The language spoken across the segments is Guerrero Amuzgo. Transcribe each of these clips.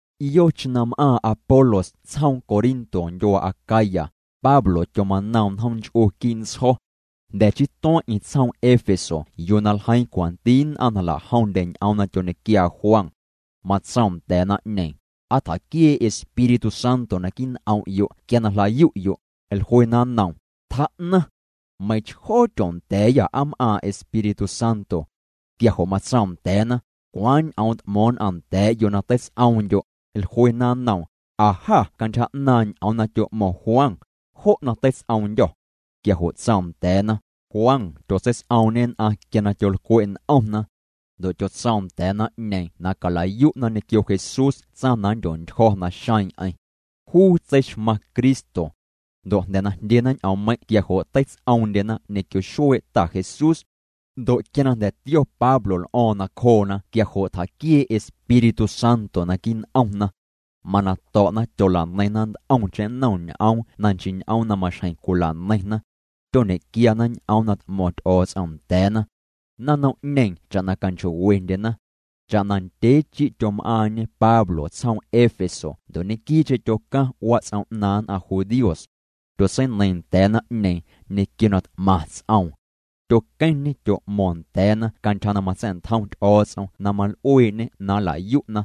Yocheⁿ na m'aaⁿ Apolos tsjoom Corinto ndyuaa Acaya, Pablo tyomanoom njoom nch'u quii' ntsjo̱. Jnda̱ chii tueⁿ'eⁿ tsjoom Éfeso yuu na ljeiiⁿ cwanti nn'aⁿ na jla'jomndye ñ'oom na tyoñequiaa Juan. Matsoom nda̱a̱ naⁿ'ñeeⁿ: —¿Aa tjaquiee' Espíritu Santo naquii' n'om'yo' quia na jlayu'yo'? Jluena nnoom: —Tjaa'naⁿ. Meiⁿchjoo tyoondya̱a̱yâ aa m'aaⁿ Espíritu Santo. Quia jo' matsoom nda̱a̱na: —¿Cwaaⁿ ñ'oom t'mo̱o̱ⁿ nn'aⁿ nda̱a̱'yo' na teits'oomndyo'? Jluena nnoom: —Aa jâ cantyja 'naaⁿ' ñ'oom na tyo'mo̱ⁿ Juan, jo' na teits'oomndyô̱. Quia jo' tsoom nda̱a̱na: —Juan tyotseits'oomñê nn'aⁿ quia na tyolcwe' n'omna. Ndo' tyotsoom nda̱a̱ naⁿ'ñeeⁿ na cala'yu'na ñequio Jesús tsaⁿ na nndyontyjo̱ naxeeⁿ'eⁿ. Juu tseixmaⁿ Cristo. Ndo' jnda̱ na jndyena ñ'oommeiⁿ' quia jo' teits'oomndyena ñequio xuee' Ta Jesús. Ndo' quia na jnda̱ tio Pablo l'o̱o̱ⁿ nacjoona quia jo' tjaquiee' Espíritu Santo naquii' n'omna. Mana to̱'na tyola'neiⁿna nt'omcheⁿ nnom ñ'oom na nchii ñ'oom na maxjeⁿ cwila'neiⁿna. Tyoñe'quiana ñ'oom na t'mo̱ⁿ Ty'o̱o̱ts'om nda̱a̱na. Naⁿnom'ñeeⁿ cha'na canchoo'wendyena. Cha'na ndyee chi' tyom'aaⁿñe Pablo tsjoom Éfeso ndo' ñequii'cheⁿ tyocaⁿ wats'om 'naaⁿ nn'aⁿ judíos. Tyotseineiiⁿ nda̱a̱ naⁿ'ñeeⁿ ñequio na t'maⁿ ts'oom. Tyoqueⁿñê tyo'mo̱o̱ⁿ nda̱a̱na cantyja na matsa̱'ntjom Ty'o̱o̱ts'om na mal'uee'ñê na nla'yu'na.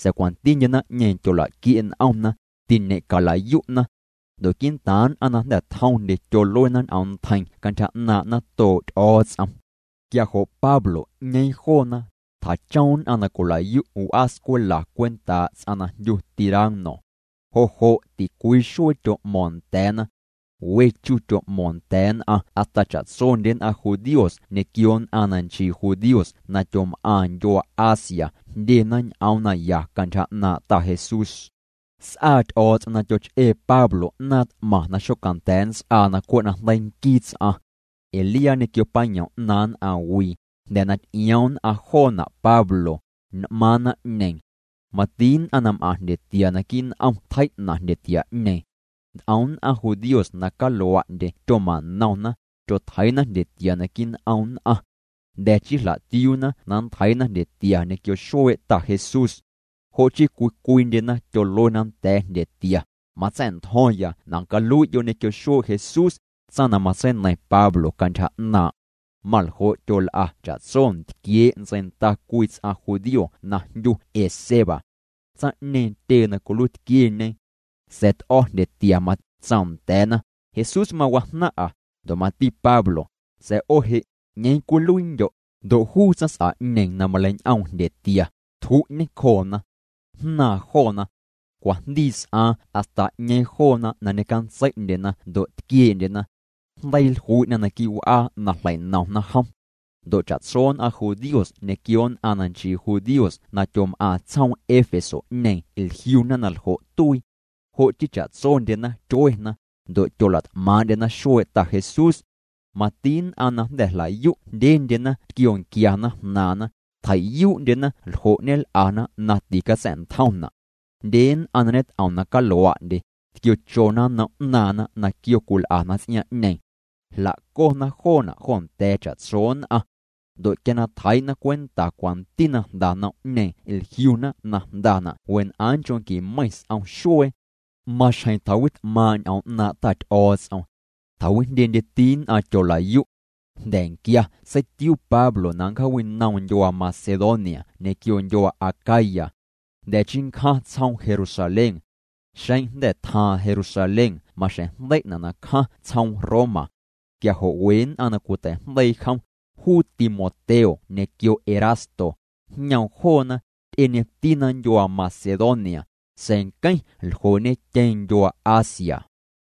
Sa̱a̱ cwantindye naⁿ'ñeeⁿ tyola'quie' n'omna, tiñe'cala'yu'na. Ndo' quii'ntaaⁿ nn'aⁿ na jnda̱ tjomndye tyoluena ñ'oom ntjeiⁿ cantyja 'naaⁿ' natoo' Ty'o̱o̱ts'om. Quia jo' Pablo 'ñeeⁿ joona, tjachom nn'aⁿ na cwila'yu' w'aa scwela cwentaa' ts'aⁿ na jndyu Tirano. Jo' jo' ticwii xuee tyo'mo̱o̱ⁿ nda̱a̱na. We chu tyo'mo̱o̱ⁿ nda̱a̱ nn'aⁿ hasta cha'tsondye nn'aⁿ judíos ñequio nn'aⁿ na nchii judíos na tyom'aⁿ ndyuaa Asia jndyena ñ'oom naya cantyja 'naaⁿ' Ta Jesús. S'aa Ty'o̱o̱ts'om na tyoch'ee Pablo 'naaⁿ t'maⁿ na xocanda̱a̱ nnts'aa na cwe' najndeii nquii ts'aⁿ. Ee liaa ñequio payom 'naaⁿ nn'aⁿwii, jnda̱ na ty'ioom nn'aⁿ joona' Pablo, n'maaⁿ naⁿwii'ñeeⁿ. Mati nn'aⁿ na m'aⁿ jndyetia naquii' n'om tjei'na' jndyetia'ñeeⁿ. Nt'om nn'aⁿ judíos na calua'ndye tyoma'nomna, tyotjeii'na jndyetia naquii' n'om nn'aⁿ. Jnda̱ chii jla'tiuuna na nntjeii'na jndyetia ñequio xuee' Ta Jesús. Jo' chii cwii cwiindyena tyoluena nda̱a̱ jndyetia: —Matsa̱'ntjo̱ⁿya na calui'yo' ñequio xuee' Jesús, tsaⁿ na matseineiⁿ Pablo cantyja 'naaⁿ'. Maljo' tyol'a cha'tso ntquiee' ntseinda cwii ts'aⁿ judío na jndyu Esceva. Tsaⁿ'ñeeⁿ tyee na cwiluiitquieñe. Sa̱a̱ t'o̱ jndyetia, matsoom nda̱a̱na: —Jesús mawajnaⁿ'a, ndo' mati Pablo, sa̱a̱ 'o je' ¿'ñeeⁿ cwiluiindyo'? Ndo' juu tsaⁿs'a'ñeeⁿ na maleiñ'oom jndyetia, tju'ñê nacjoona. Jnaaⁿ joona. Cwajndii s'aaⁿ hasta 'ñeeⁿ joona na ñecantsei'ndyena ndo' tquiee'ndyena. Jndeii jlui'na naquii' w'aa na jlei'nomna jom. Ndo' cha'tso nn'aⁿ judíos ñequio nn'aⁿ na nchii judíos na tyom'aⁿ tsjoom Éfeso'ñeeⁿ jliuna na ljo' tuii. Jo' chii cha'tsondyena tyuena, ndo' tyola't'maaⁿ'ndyena xuee' Ta Jesús. Mati nn'aⁿ na jnda̱ jla'yu' jndyendyena tquionquiana jnaaⁿna, tjei'yuu'ndyena ljo' ñel'ana na ticatsa̱'ntjomna'. Jndye nn'aⁿ na ñet'om na calua'ndye, tquiochona nom 'naaⁿna na quio cwil'ana ts'iaaⁿ'ñeeⁿ. Jla'cona joona' jo nda̱a̱ cha'tso nn'aⁿ. Ndo' quia na tjeii'na cwenta cwanti na jnda nom'ñeeⁿ jliuna na jndana' wen'aaⁿ nchoo' qui meiⁿ s'om xuee. Maxjeⁿ tjawit'maaⁿ' ñ'oom 'naaⁿ' Ta Ty'o̱o̱ts'om. Tjawijndyendyeti nn'aⁿ tyola'yu'. Jnda̱nquia seitiuu Pablo na nncjaawinoom ndyuaa Macedonia ñequio ndyuaa Acaya. Jnda̱ chii nncjaⁿ tsjoom Jerusalén. Xeⁿ jnda̱ tjaaⁿ Jerusalén maxjeⁿ jndei'na' na cjaⁿ tsjoom Roma. Quia jo' we nn'aⁿ na cwitei'jndeii jom, juu Timoteo ñequio Erasto, jñoom joona, ty'eñetina ndyuaa Macedonia, sa̱a̱ nqueⁿ ljoo'ñetyeeⁿ ndyuaa Asia.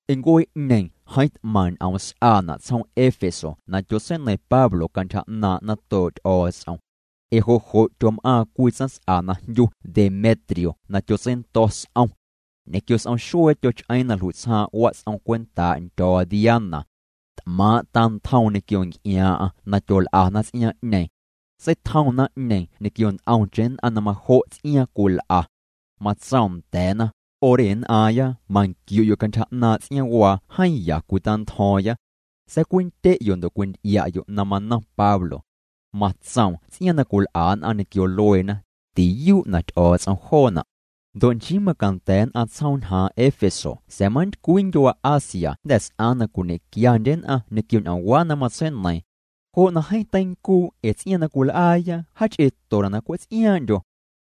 Ncuee'ñeeⁿ jeeⁿ t'maⁿ ñ'oom s'aana' tsjoom Éfeso na tyotseineiⁿ Pablo cantyja 'naaⁿ' natoo' Ty'o̱o̱ts'om. Ee jo' jo' tyom'aaⁿ cwii tsaⁿs'a na jndyu Demetrio na tyotseindo̱ s'om. Ñequio s'om xuee tyoch'eeⁿ na jlui'tsjaaⁿ wats'om cwentaa' ndyo̱o̱ Diana. T'maaⁿ' tantjoom ñequio nc'iaaⁿ'aⁿ na tyol'ana ts'iaaⁿ'ñeeⁿ. Seitjoom naⁿ'ñeeⁿ ñequio nt'omcheⁿ nn'aⁿ na majo' ts'iaaⁿ cwil'a. Matsoom nda̱a̱na: —'O re nn'aⁿya manquiu'yo' cantyja 'naaⁿ' ts'iaaⁿwaa jeeⁿ ya cwitantjo̱o̱ⁿya. Sa̱a̱ cwindye'yo' ndo' cwinty'ia'yo' na manom Pablo. Matsoom ts'iaaⁿ na cwil'a nn'aⁿ ñequio lueena, tiyuu' na Ty'o̱o̱ts'om joona'. Ndo' nchii macanda̱ nn'aⁿ tsjoom ñjaaⁿ Éfeso sa̱a̱ manntycwii ndyuaa Asia jnda̱ s'aaⁿ na cwiñequiandye nn'aⁿ ñequio ñ'oomwaa' na matseineiiⁿ. Jo' na jeeⁿ teincuu' ee ts'iaaⁿ na cwil'aaya jaach'eetona' na cwe' ts'iaaⁿ'ndyo.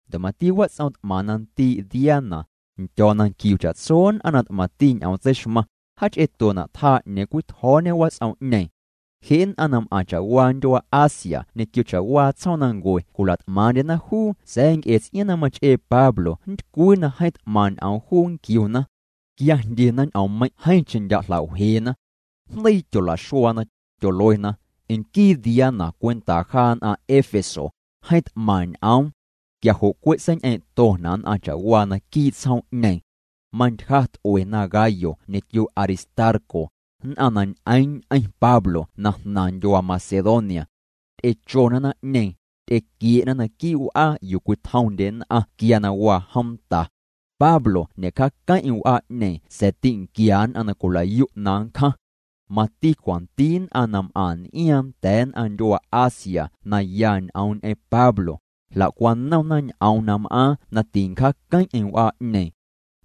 Ndo' mati wats'om t'maⁿ na ndii' Diana, ndyo̱o̱ na nquiu cha'tso nn'aⁿ na t'maⁿti ñ'oom tseixmaⁿ, jaach'eetona' tjaa 'ñeeⁿ cwitjo̱o̱ñe wats'om'ñeeⁿ. Je' nn'aⁿ na m'aⁿ cha'waa ndyuaa Asia ñequio cha'waa tsjoomnancue cwila't'maaⁿ'ndyena juu sa̱a̱ cwe' ts'iaaⁿ na mach'ee Pablo nntycwii na jeeⁿ t'maⁿ ñ'oom juu nquiuna. Quia jndyena ñ'oommeiⁿ' jeeⁿcheⁿ ndya' jla'wjeena. Jndeii tyola'xuaana, tyoluena: —Nquii Diana cwentaa jaa nn'aⁿ Éfeso, jeeⁿ t'maⁿ ñ'oom. Quia jo' cwe' seiñ'eeⁿ'tona' nn'aⁿ cha'waa naquii' tsjoom'ñeeⁿ. Mantyja t'uena Gayo ñequio Aristarco, nn'aⁿ na ñ'eeⁿ ñ'eⁿ Pablo na jnaⁿ ndyuaa Macedonia. Ty'echona naⁿ'ñeeⁿ, ty'equie'na naquii' w'aa yuu cwitjomndye nn'aⁿ quia na waa jomta. Pablo ñe'cjaaqueⁿ'eⁿ w'aa'ñeeⁿ sa̱a̱ tinquia nn'aⁿ na cwila'yu' na nncjaⁿ. Mati cwanti nn'aⁿ na m'aⁿ n'iaaⁿ nda̱a̱ nn'aⁿ ndyuaa Asia na ya ñ'oom ñ'eⁿ Pablo, jla'cwanomna ñ'oom na m'aaⁿ na tincjaaqueⁿ'eⁿ w'aa'ñeeⁿ.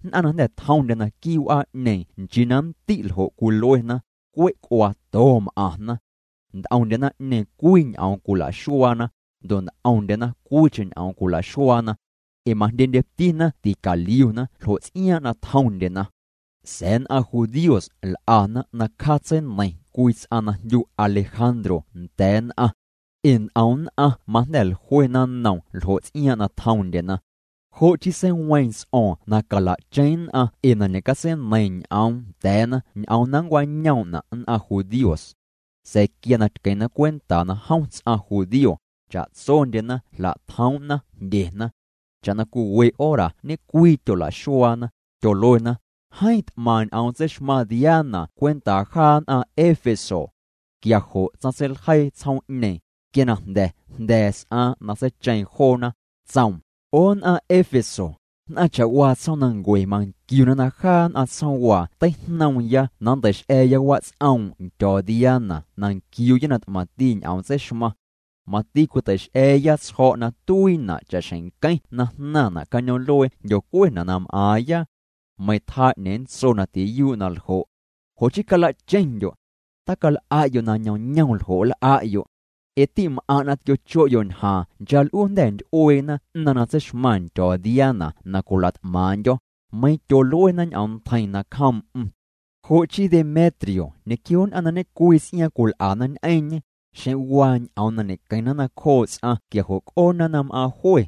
Nn'aⁿ na jnda̱ tjomndye naquii' w'aa'ñeeⁿ nchii na nndi' ljo' cwiluena, cwe' c'uaato m'aⁿna. Nt'omndye naⁿ'ñeeⁿ cwii ñ'oom cwila'xuaana, ndo' nt'omndyena cwiicheⁿ ñ'oom cwila'xuaana. Ee majndyendyetina ticaliuna ljo ts'iaaⁿ' na tjomndyena. Sa̱a̱ nn'aⁿ judíos l'ana na cjaatseineiⁿ cwii ts'aⁿ na jndyu Alejandro nda̱a̱ nn'aⁿ. Ee nt'om nn'aⁿ majnda̱ jluena nnoom ljo' ts'iaaⁿ' na tjomndyena. Jo' chii seiweeⁿ ts'o̱o̱ⁿ na cala'cheⁿ nn'aⁿ ee na ñe'catseineiiⁿ ñ'oom nda̱a̱na ñ'oom na ncwañoom'na' nn'aⁿ judíos. Sa̱a̱ quia na tqueⁿna cwenta na jom ts'aⁿ judío, cha'tsondyena jla'tjoom'na jndyeena. Cha'na cwii we hora ñe'cwii tyola'xuaana, tyoluena: —Jeeⁿ t'maⁿ ñ'oom tseixmaⁿ Diana cwentaa jaa nn'aⁿ Éfeso. Quia jo' tsaⁿtseiljeii tsjoom'ñeeⁿ, quia na jnda̱ jnda̱a̱ s'aaⁿ na seicheeⁿ joona, tsoom: —'O nn'aⁿ Éfeso, nn'aⁿ cha'waa tsjoomnancue manquiuna na jaa nn'aⁿ tsjoomwaa teijnoomya na nntei'x'a̱a̱ya wats'oom' ndyo̱o̱ Diana na nquiuuya na t'maⁿti ñ'oom tseixmaⁿ. Mati cwitei'x'a̱a̱ya tsjo̱' na tuiina' cha'xjeⁿ nqueⁿ na jnaⁿna' cañoom'luee jndyocuena' na m'aaⁿya. Meiⁿ tjaa 'ñeeⁿ nntso na tiyuu' na ljo'. Jo' chii cala'cheⁿndyo'. Tacal'a'yo' na ñoomñoom ljo' nl'a'yo'. Ee ti'm'aⁿ' na tquio'cho'yo' ñjaaⁿ chaa' l'uu jnda̱ nty'ueena 'naⁿ na tseixmaⁿ ndyo̱o̱ Diana na cwila't'maaⁿ'ndyo̱, meiⁿ tyooluena ñ'oom ntjeiⁿ nacjoom'm. Jo' chii Demetrio ñequio nn'aⁿ na ñe'cwii ts'iaaⁿ cwil'ana ñ'eⁿñê, xeⁿ waa ñ'oom na ñe'queⁿna nacjoo' ts'aⁿ quia jo' c'oona na m'aaⁿ jwe.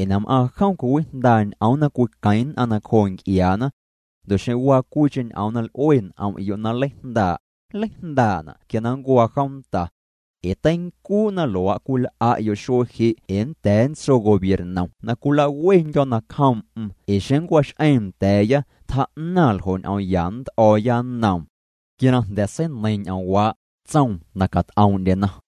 Ee na m'aaⁿ jom cwiwijndaa' ñ'oom na cwiqueⁿ nn'aⁿ nacjoo nc'iaana. Ndo' xeⁿ waa cwiicheⁿ ñ'oom na l'ue n'om'yo' na nleijndaa', nleijndaa'na' quia na nncuaa jomta. Ee teincuu' na luaa' cwil'a'yo' xuee je' ee nnda̱a̱ nntso gobiernom na cwilawendyo̱ nacjoom'm ee xeⁿ nncwax'eeⁿ nda̱a̱ya tjaa'naⁿ ljo' ñ'oom ya nnt'o̱o̱ya nnoom. Quia na jnda̱ seineiiⁿ ñ'oomwaa', tsoom na cat'oom'ndyena.